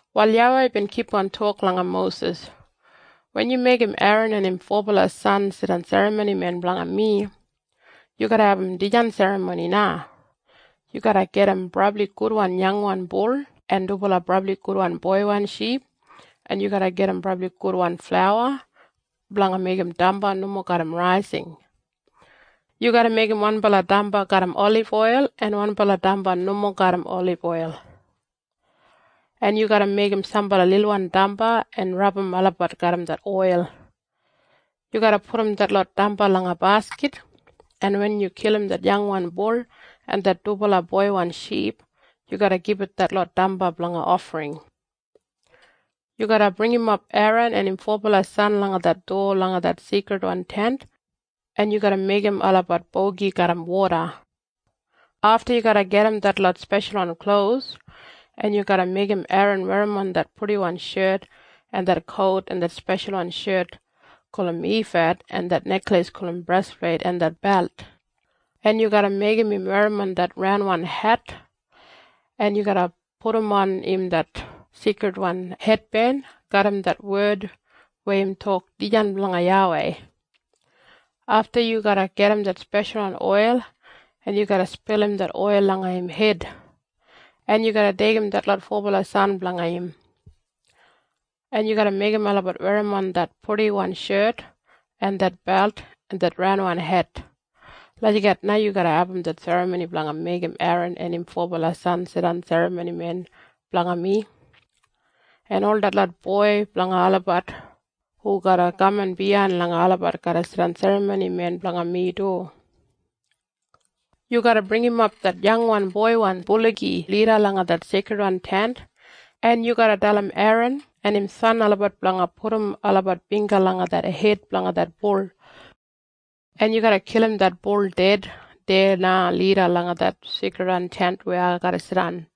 Wal YAWEI bin kipgon tok langa Mosis, “Wen yu meigim Eran en im fobala san jidan serramonimen blanga mi, yu garra abum dijan serramoni na. Yu garra gajim brabli gudwan yangwan bul en dubala brabli gudwan boiwan ship, en yu garra gajim brabli gudwan flauwa blanga meigim damba nomo garram raising. Yu garra meigim wanbala damba garram oliboil en wanbala damba nomo garram oliboil, en yu garra meigim sambala lilwan damba en rabum olabat garram det oil. Yu garra pudum detlot damba langa baskit, en wen yu kilim det yangwan bul en det dubala boiwan ship, yu garra gibit detlot damba blanga ofring. “Yu garra bringimap Eran en im fobala san langa det dowa langa det Seikridwan Tent, en yu garra meigim olabat bogi garram woda. Afta yu garra gajim detlot speshalwan klos, en yu garra meigim Eran werrimon det purdiwan shet en det kout en det speshalwan shet gulum ifad en det nekleis gulum brespleit en det belt, en yu garra meigim im werrimon det raunwan het, en yu garra pudumon im det seikridwan hetben garram det wed weya im tok Dijan Blanga YAWEI. Afta yu garra gajim det speshalwan oil, en yu garra spilim det oil langa im hed, en yu garra deigim detlot fobala san blanga im, en yu garra meigim olabat werrimon det purdiwan shet en det belt en det raunwan het. Lagijat na yu garra abum det serramoni blanga meigim Eran en im fobala san jidan serramonimen blanga mi, en ol detlot boi blanga olabat hu garra kaman biyain langa olabat garra jidan serramonimen blanga mi du. “Yu garra bringimap det yangwan boiwan buligi lida langa det Seikridwan Tent, en yu garra dalim Eran en im san olabat blanga pudum olabat bingga langa det hed blanga det buligi, en yu garra kilim im ded deya na lida langa det Seikridwan Tent weya ai garra jidan,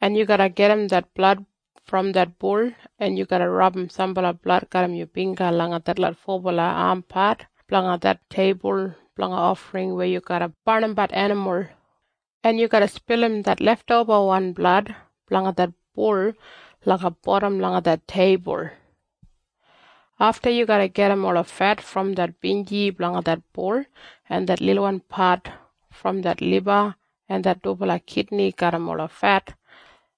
en yu garra gajim det blad brom det buligi, en yu garra rabum sambala blad garram yu bingga langa detlot fobala ampat blanga det teibul blanga ofring weya yu garra barnimbat enimul, en yu garra spilim det leftobawan blad blanga det buligi langa bodam langa det teibul. Afta yu garra gajim ola fet brom det binji blanga det buligi en det lilwan pat brom det liba en det dubala kidni garram ola fet,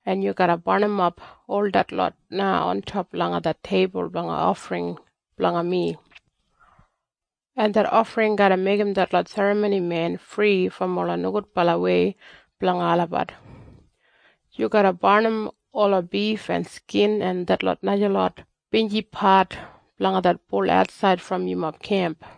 en yu garra barnimap ol detlot na ontop langa det teibul blanga ofring blanga mi, en det ofring garra meigim detlot serramonimen fri brom ola nogudbalawei blanga olabat. Yu garra barnim ola bif en skin en detlot najalot binjipat blanga det buligi atsaid brom yumob kemp.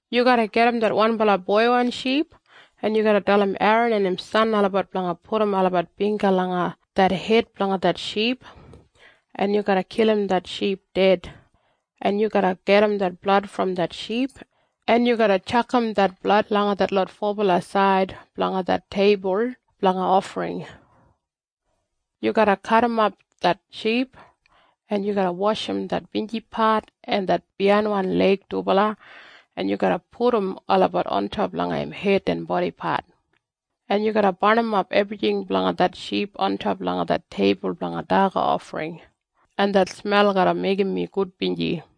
“Yu garra gajim det wanbala boiwan ship, en yu garra dalim Eran en im san olabat blanga pudum olabat bingga langa det hed blanga det ship, en yu garra kilim det ship ded, en yu garra gajim det blad brom det ship, en yu garra tjakam det blad langa detlot fobala said blanga det teibul blanga ofring. Yu garra kadimap det ship, en yu garra washim det binjipat en det biyainwan leig dubala, en yu garra pudum olabat ontop langa im hed en bodipat, en yu garra barnimap ebrijing blanga det ship ontop langa det teibul blanga daga ofring, en det smel garra meigim mi gudbinji.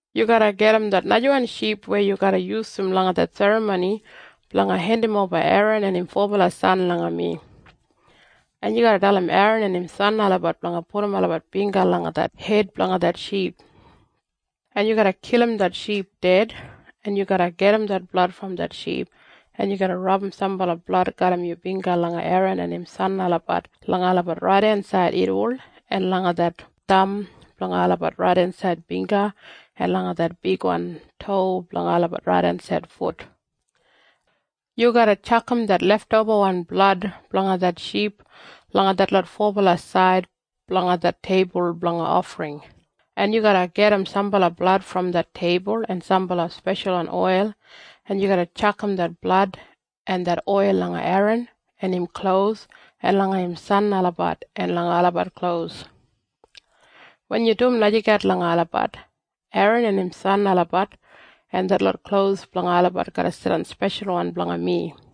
“Yu garra gajim det najawan ship weya yu garra yusum langa det serramoni blanga hendimoba Eran en im fobala san langa mi, en yu garra dalim Eran en im san olabat blanga pudum olabat bingga langa det hed blanga det ship, en yu garra kilim det ship ded, en yu garra gajim det blad brom det ship, en yu garra rabum sambala blad garram yu bingga langa Eran en im san olabat langa olabat raidensaid irriwol en langa det tham blanga olabat raidensaid bingga en langa det bigwan tou blanga olabat raidensaid fut. Yu garra tjakam det leftobawan blad blanga det ship langa detlot fobala said blanga det teibul blanga ofring, en yu garra gajim sambala blad brom det teibul en sambala speshalwan oil, en yu garra tjakam det blad en det oil langa Eran en im klos en langa im san olabat en langa olabat klos. Wen yu dum lagijat langa olabat, Eran en im san olabat en detlot klos blanga olabat garra jidan speshalwan blanga mi.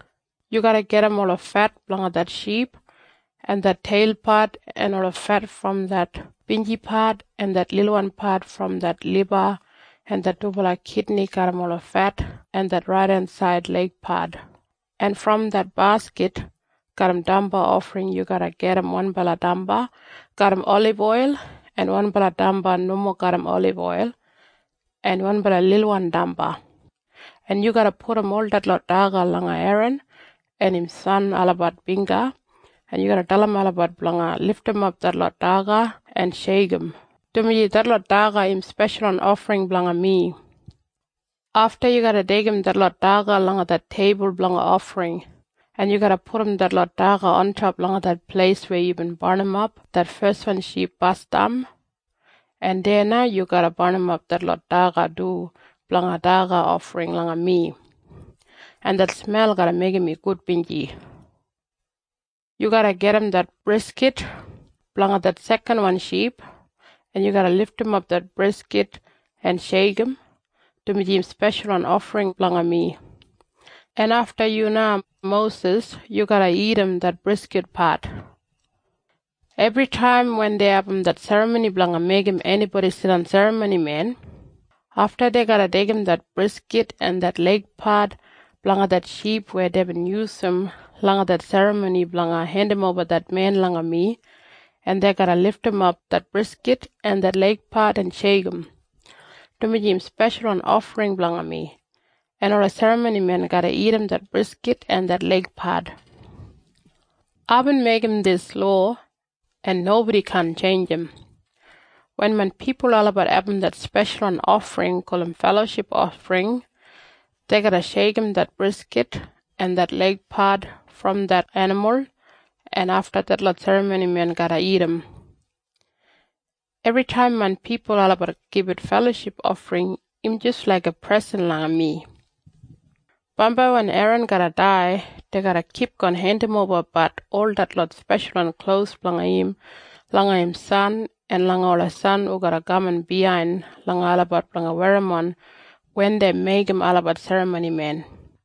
“Yu garra gajim ola fet blanga det ship en det teilpat en ola fet brom det binjipat en det lilwan pat brom det liba en det dubala kidni garram ola fet en det raidensaid leigpat, en brom det baskit garram damba ofring yu garra gajim wanbala damba garram oliboil en wanbala damba nomo garram oliboil en wanbala lilwan damba, en yu garra pudum ol detlot daga langa Eran en im san olabat bingga, en yu garra dalim olabat blanga lidimap detlot daga en sheikim, dumaji detlot daga im speshalwan ofring blanga mi. Afta yu garra deigim detlot daga langa det teibul blanga ofring, en yu garra pudum detlot daga ontop langa det pleis weya yubin barnimap det feswan ship basdam, en deya na yu garra barnimap detlot daga du blanga daga ofring langa mi, en det smel garra meigim mi gudbinji. “Yu garra gajim det briskit blanga det sekanwan ship, en yu garra lidimap det briskit en sheikim, dumaji im speshalwan ofring blanga mi, en afta yu na, Mosis, yu garra dagat det briskitpat. “Ebritaim wen dei abum det serramoni blanga meigim enibodi jidan serramonimen, afta, dei garra deigim det briskit en det leigpat blanga det ship weya deibin yusum langa det serramoni blanga hendimoba det men langa mi, en dei garra lidimap det briskit en det leigpat en sheikim, dumaji im speshalwan ofring blanga mi, en ola serramonimen garra dagat det briskit en det leigpat. “Aibin meigim dis lowa, en nobodi kaan tjeinjim. Wen main pipul olabat abum det speshalwan ofring gulum feloship ofring, dei garra sheikim det briskit en det leigpat brom det enimul, en afta detlot serramonimen garra dagat. Ebritaim main pipul olabat gibit feloship ofring im jis laiga presen langa mi. “Bambai wen Eran garra dai, dei garra kipgon hendimobabat ol detlot speshalwan klos blanga im langa im san en langa ola san hu garra kaman biyain langa olabat blanga werrimon wen dei meigim olabat serramonimen.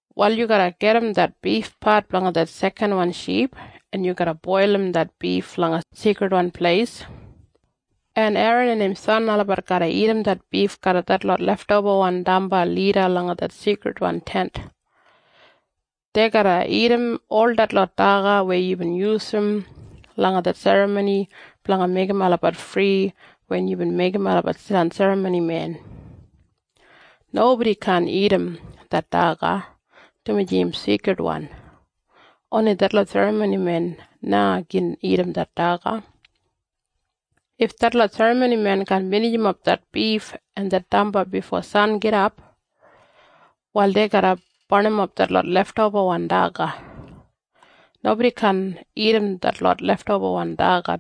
“Wal yu garra gajim det bifpat blanga det sekanwan ship, en yu garra boilim det bif langa Seikridwan Pleis, en Eran en im san olabat garra dagat det bif garram detlot leftobawan damba lida langa det Seikridwan Tent. Dei garra dagat ol detlot daga weya yubin yusum langa det serramoni blanga meigim olabat fri wen yubin meigim olabat jidan serramonimen. Nobodi kaan dagat det daga, dumaji im seikridwan. Oni detlot serramonimen na gin dagat det daga. If detlot serramonimen kaan binijimap det bif en det damba bifo sangidap, wal dei garra barnimap detlot leftobawan daga. Nobodi kaan dagat detlot leftobawan daga,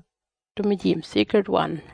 dumaji im seikridwan.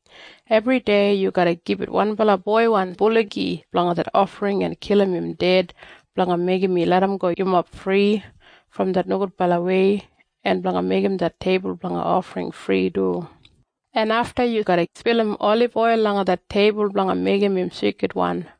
Ebridei yu garra gibit wanbala boiwan buligi blanga det ofring en kilim im ded blanga meigim mi larramgo yumob fri brom det nogudbalawei en blanga meigim det teibul blanga ofring fri du, en afta yu garra spilim oliboil langa det teibul blanga meigim im seikridwan.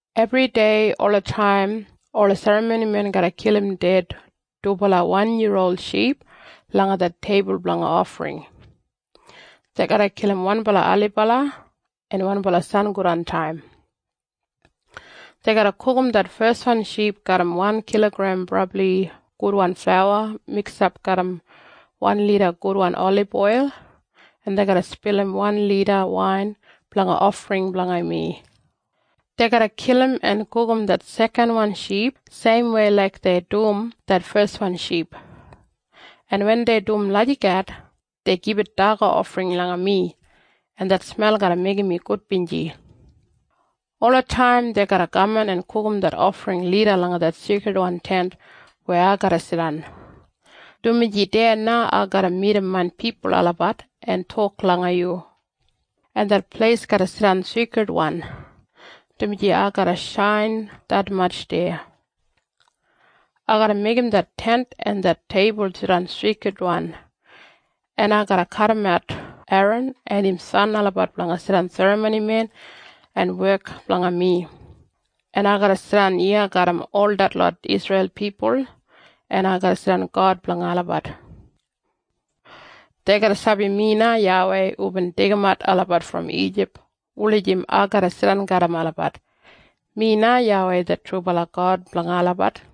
“Ebridei olataim ola serramonimen garra kilim ded dubala wan yiya ol ship langa det teibul blanga ofring. Dei garra kilim wanbala ailibala en wanbala sangodantaim. Dei garra gugum det feswan ship garram wan kilogrem brabli gudwan flauwa miksap garram wan lita gudwan oliboil, en dei garra spilim wan lita wain blanga ofring blanga mi. Dei garra kilim en gugum det sekanwan ship seimwei laik dei dum det feswan ship. En wen dei dum lagijat, dei gibit daga ofring langa mi, en det smel garra meigim mi gudbinji. Olataim dei garra kaman en gugum det ofring lida langa det Seikridwan Tent weya ai garra jidan, dumaji deya na ai garra midim main pipul olabat en tok langa yu, en det pleis garra jidan seikridwan, dumaji ai garra shain detmatj deya. Ai garra meigim det Tent en det teibul jidan seikridwan, en ai garra kadimat Eran en im san olabat blanga jidan serramonimen en wek blanga mi, en ai garra jidan iya garram ol detlot Isreil pipul, en ai garra jidan God blanga olabat. Dei garra sabi mi na YAWEI hubin deigimat olabat brom Ijip wulijim ai garra jidan garram olabat. Mi na YAWEI det trubala God blanga olabat.”